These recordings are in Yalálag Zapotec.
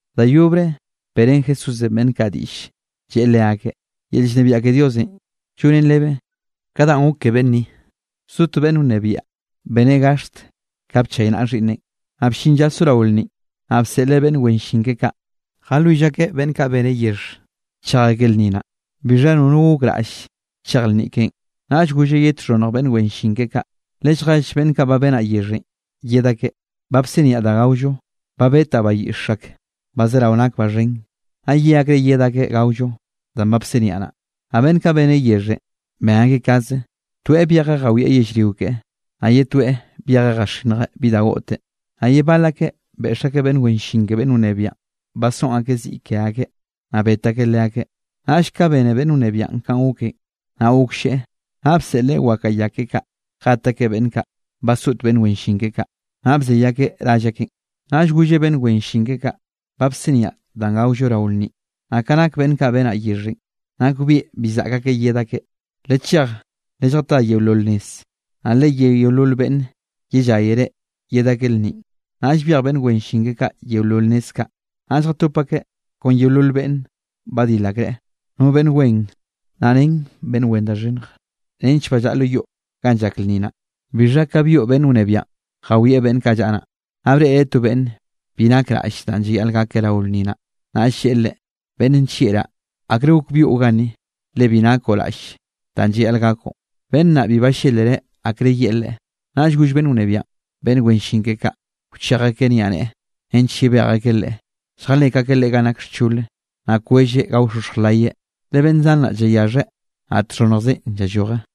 Da yobre beꞌrén Jesúsenꞌ beꞌnn kaꞌ diꞌll lleꞌe leakeꞌ: —Yel llnebiaꞌ ke Diosenꞌ, llonen rebe ka danꞌ gok ke beꞌnn ni. Bzo to beꞌnn wnebiaꞌ beneꞌ gaxt ka bchaynaꞌa xhiꞌnneꞌn. Naꞌ bllin lla sorao lnninꞌ, naꞌ bseꞌleꞌ beꞌnn wen llin keꞌe kaꞌ, jalwill akeꞌ beꞌnn kaꞌ beneꞌ yexh chej akeꞌ lnni naꞌ, bixha nono gokraꞌll chej lnni keꞌen. Naꞌll golleꞌ ye txhonnj beꞌnn wen llin keꞌe kaꞌ: “Lelljell beꞌnn kaꞌ ba benaꞌ yexhenꞌ yed akeꞌ, ba bsiniaꞌ da gaollo. Ba betaꞌ bayiꞌx ak ba zerao nak ba xhen. Naꞌ ye akreꞌ yed akeꞌ gaollo danꞌ ba bsiniaꞌ naꞌ.” Naꞌ beꞌnn kaꞌ beneꞌ yexhenꞌ ben akeꞌ kaze. Toeꞌ byejeꞌ jawieꞌ yellrio keꞌe, naꞌ ye toeꞌ byejeꞌ jaxinnjeꞌ bi da goꞌteꞌ. Naꞌ ye bal akeꞌ beꞌx akeꞌ beꞌnn wen llin ke beꞌnn wnebiaꞌn, basoꞌn akeꞌ ziꞌ ke akeꞌ, naꞌ bet akeꞌ leakeꞌ. Naꞌll ka bene beꞌnn wnebiaꞌn kanꞌ goken, naꞌ goklleꞌe. Naꞌ bseꞌleꞌ wakaꞌa ya keꞌe kaꞌ jet akeꞌ beꞌnn kaꞌ basoꞌt beꞌnn wen llin keꞌe kaꞌ, naꞌ bzey akeꞌ rall akeꞌn. Naꞌll golleꞌ beꞌnn wen llin keꞌe kaꞌ: “Ba bsiniaꞌ danꞌ gaollo rao lnninꞌ, naꞌ ka nak beꞌnn kaꞌ benaꞌ yexhenꞌ nakbieꞌ bi zaꞌk akeꞌ yed akeꞌ. Lechej lelljatá yeolol nez, naꞌ leyé yeolol beꞌnn yellayre yed akeꞌ lnninꞌ.” Naꞌll byej beꞌnn wen llin kaꞌ yeolol nez kaꞌ, naꞌll jatop akeꞌ kon yeolol beꞌnne badil akreꞌ, no beꞌnn wen, naꞌ ren beꞌnn wen da xhinnj, nench ballaꞌa lo yoꞌ ganꞌ llak lnni naꞌ. ’Bixha ka byoꞌ beꞌnn wnebiaꞌn jawieꞌ beꞌnn kaꞌ llaꞌa naꞌ, naꞌ breꞌreꞌ to beꞌnne bi nakeꞌ raꞌll danꞌ llayaꞌl gakeꞌ rao lnni naꞌ. Naꞌll lleꞌe leꞌe: “Beꞌnn nllieꞌraꞌ, ¿akre gok byoꞌ ganni, le bi nakoꞌ raꞌll danꞌ llayaꞌl gakoꞌ?” Beꞌnn naꞌ bibi ballelreꞌ akre yeꞌe leꞌe. Naꞌll goll beꞌnn wnebiaꞌn beꞌnn wen llin keꞌe kaꞌ, wchej akeꞌ niaꞌneꞌe nench yebej akeꞌ leꞌe, lljalek akeꞌ leꞌe ganꞌ nak xchol, naꞌ kwelleꞌ gaoxoxj layeꞌ. Le beꞌnn zan naꞌ llayaxheꞌ, naꞌ txhonnjzeꞌn llalloj.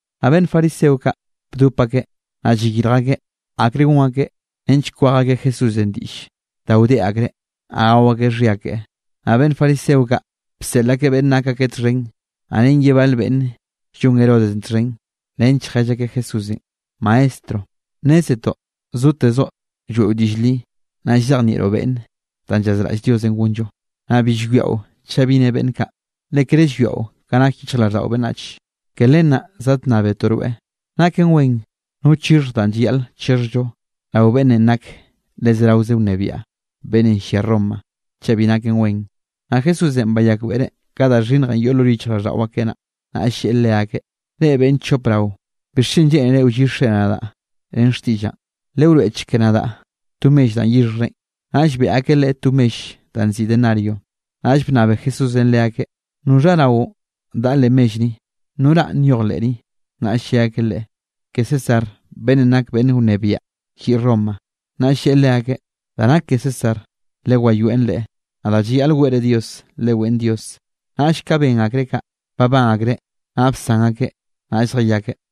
Naꞌ beꞌnn fariseo kaꞌ bdop akeꞌ, naꞌ llayirj akeꞌ akrenꞌ gon akeꞌ, nench kwej akeꞌ Jesúsenꞌ diꞌll da wdeꞌ akreꞌ, naꞌ gao akeꞌ xhia keꞌe. Naꞌ beꞌnn fariseo kaꞌ, bseꞌl akeꞌ beꞌnne nak akeꞌ txhen, naꞌ ren ye bale beꞌnn llon Herodes txhen, nench jell akeꞌ Jesúsenꞌ: —Maestro, nnézetoꞌ zotezoꞌ lloeꞌo diꞌll li, naꞌ llzejnieꞌroꞌ beꞌnne danꞌ llazraꞌll Diosenꞌ gonllo, naꞌ bi llwiaꞌo chaꞌ bi ne beꞌnn kaꞌ, le kere llwiaꞌo ka nak yichjrao beꞌnnach. Ke len naꞌ zadnnábetoꞌ rweꞌ. ¿Naken wen no chixhj da llayaꞌl chixhjllo rao beꞌnnenꞌ nak le zeraoze wnebiaꞌ, beꞌnnenꞌ llia Roma, chaꞌ bi naken wen? Naꞌ Jesúsenꞌ bayakbeꞌreꞌ ka da xhinnjenꞌ yoꞌ lo yichjraꞌlldaꞌo akeꞌ naꞌ, naꞌll lleꞌe leakeꞌ: —Reꞌ beꞌnn chop rao. ¿Bixchen lleꞌnere wllixre nadaꞌ ren xtiꞌllaꞌn? Lewroeꞌchek nadaꞌ to mell danꞌ yixhjrenꞌ. Naꞌll beꞌe akeꞌ Leꞌe to mell danꞌ nziꞌi denario. Naꞌll bnnabe Jesúsenꞌ leakeꞌ: —¿Noxha raonꞌ daꞌa leꞌ mell ni? ¿No ranꞌ nyoj leꞌ ni? Naꞌll lle akeꞌ Leꞌe: —Ke César beꞌnnenꞌ nak beꞌnn wnebiaꞌn lliꞌ Romanꞌ. Naꞌll lleꞌe leakeꞌ: —Da nak ke César lewayoeꞌn leꞌe; naꞌ da llayaꞌl weꞌre Dios, leweꞌn Dios. Naꞌll ka ben akreꞌ kaꞌ, babán akreꞌ naꞌ bsan akeꞌ, naꞌll zjayakeꞌ.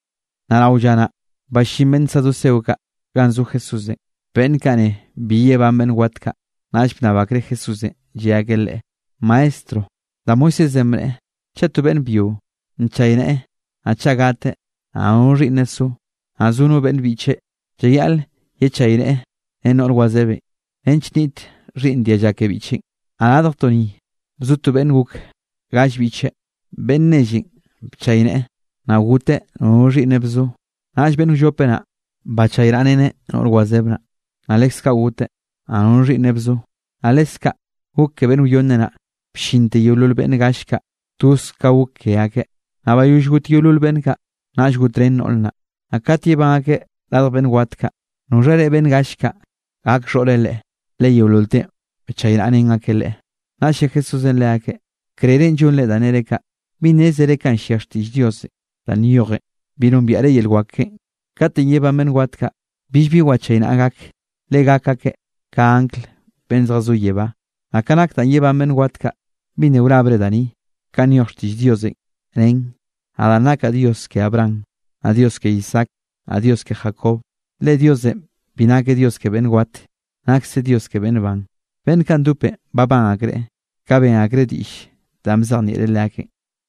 Naꞌ rao lla naꞌ, ballín beꞌnn saduceo kaꞌ ganꞌ zo Jesúsenꞌ. Beꞌnn kaꞌ ne bi yebán beꞌnn wat kaꞌ, naꞌll bnnab akreꞌ Jesúsenꞌ, lle akeꞌ Leꞌe: —Maestro, da Moisésenꞌ bneꞌe, chaꞌ to beꞌnn byio nchayneꞌe, naꞌ chaꞌ gateꞌ, naꞌ nono xhiꞌnneꞌ so, naꞌ no beꞌnn biꞌcheꞌ llayaꞌl yechayneꞌe ren noꞌr wazebenꞌ, nench nniꞌt xhiꞌnn dialla ke biꞌcheꞌn. Naꞌ radjtoꞌ ni bzo beꞌnn gok gall biꞌcheꞌ, beꞌnn nellenꞌ bchayneꞌe, naꞌ goteꞌ nono xhiꞌnneꞌ bzo. Naꞌll beꞌnn wllope naꞌ, bachaynaꞌreneꞌ noꞌr wazeb naꞌ. Naꞌ leskaꞌ goteꞌ, naꞌ nono xhiꞌnneꞌ bzo. Naꞌ leskaꞌ gok ke beꞌnn wyonne naꞌ, bllinte yeolol beꞌnn gall kaꞌ, toz kaꞌ gok ke akeꞌ. Naꞌ bayoll got yeolol beꞌnn kaꞌ, naꞌll gotrén noꞌr naꞌ. Naꞌ kat yebán akeꞌ radj beꞌnn wat kaꞌ, ¿noxhare beꞌnn gall kaꞌ gak xhoꞌre leꞌe? Le yeololteꞌn bchaynaꞌrén akeꞌ leꞌe. Naꞌll lle Jesúsenꞌ leakeꞌ: —Krerenꞌ llonre danꞌ nere kaꞌ, bi nnézere kanꞌ llia xtiꞌll Diosenꞌ danꞌ nyojen, bi nombiaꞌre yel wak keꞌen. Katenꞌ yebán beꞌnn wat kaꞌ, billbi wchaynaꞌa gak, le gak akeꞌ ka angl beꞌnn zjazó yebá. Naꞌ ka nak danꞌ yebán beꞌnn wat kaꞌ, ¿bi nna wrabre da ni, kanꞌ nyoj xtiꞌll Diosenꞌ? Nen: “Nadaꞌ nakaꞌ Dios ke Abraham, naꞌ Dios ke Isaac, naꞌ Dios ke Jacob.” Le Diosenꞌ bi nakeꞌ Dios ke beꞌnn wat, nakseꞌ Dios ke beꞌnn ban. Beꞌnn kaꞌ ndopenꞌ babán akreꞌ, ka ben akreꞌ diꞌll danꞌ bzejnieꞌreꞌ leakeꞌn.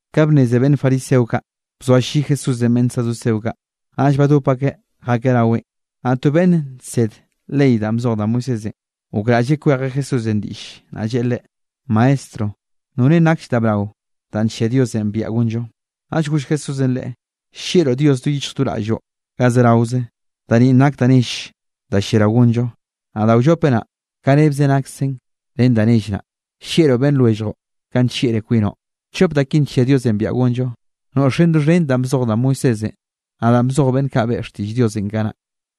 Ka bnneze beꞌnn fariseo kaꞌ, bzoalli Jesúsenꞌ beꞌnn saduceo kaꞌ, naꞌll badop akeꞌ jakeꞌ raweꞌn. Naꞌ to beꞌnn nsed ley danꞌ bzoj da Moisésenꞌ, gokraꞌlleꞌ kwejeꞌ Jesúsenꞌ diꞌll, naꞌ lleꞌe Leꞌe: —Maestro, ¿norenꞌ nakll da brao danꞌ nllia Diosenꞌ biaꞌa gonllo? Naꞌll goll Jesúsenꞌ leꞌe: —“Llieꞌroꞌ Dios do yichj do raꞌlloꞌ ga zeraoze.” Da ninꞌ nak da nell da lliarao gonllo. Naꞌ da wllope naꞌ, ka rebze naksen ren da nell naꞌ: “Llieꞌroꞌ beꞌnn lwelljoꞌ, kanꞌ nllieꞌroꞌ kwinoꞌ.” Chop da kinꞌ nllia Diosenꞌ biaꞌa gonllo, noꞌxeꞌn doxhen danꞌ bzoj da Moisésenꞌ, naꞌ danꞌ bzoj beꞌnn kaꞌ beꞌe xtiꞌll Diosenꞌ kanaꞌ.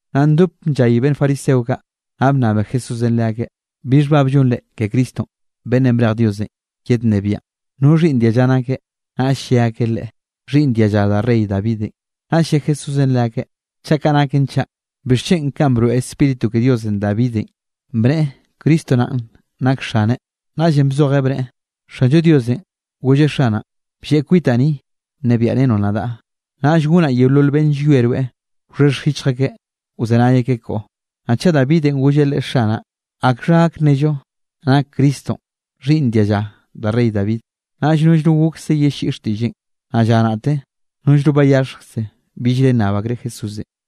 Naꞌ ndop bllay beꞌnn fariseo kaꞌ, naꞌ bnnabe Jesúsenꞌ leakeꞌ: —¿Bi xhbab llonre ke Cristonꞌ beꞌnnenꞌ brej Diosenꞌ yednnebiaꞌn? ¿No xhiꞌnn dialla nakeꞌ? Naꞌll lle akeꞌ Leꞌe: —Xhiꞌnn dialla da rey Davidenꞌ. Naꞌll lle Jesúsenꞌ leakeꞌ: —Chaꞌ kaꞌ naken chaꞌ, ¿bixchen kanꞌ broeꞌ Spíritu ke Diosenꞌ Davidenꞌ, bneꞌe Cristo naꞌn nak Xaneꞌ? Naꞌllenꞌ bzojeꞌ bneꞌe: Xanllo Diosenꞌ golleꞌ Xanaꞌn: “Blleꞌ kwitaꞌ ni nnebiaꞌrenoꞌ nadaꞌ, naꞌll gonaꞌ yeolol beꞌnn llwie rweꞌ, wxhexj yichj akeꞌ wzenay akeꞌ koꞌo.” ¿Naꞌ chaꞌ Davidenꞌ golleꞌ leꞌe “Xanaꞌ”, akxha gak nnello nak Cristonꞌ xhiꞌnn dialla da rey David? Naꞌll nollno gokse yelliꞌi xtiꞌlleꞌn. Naꞌ lla naꞌte, nollno bayaxhjkze billre nnab akreꞌ Jesúsenꞌ.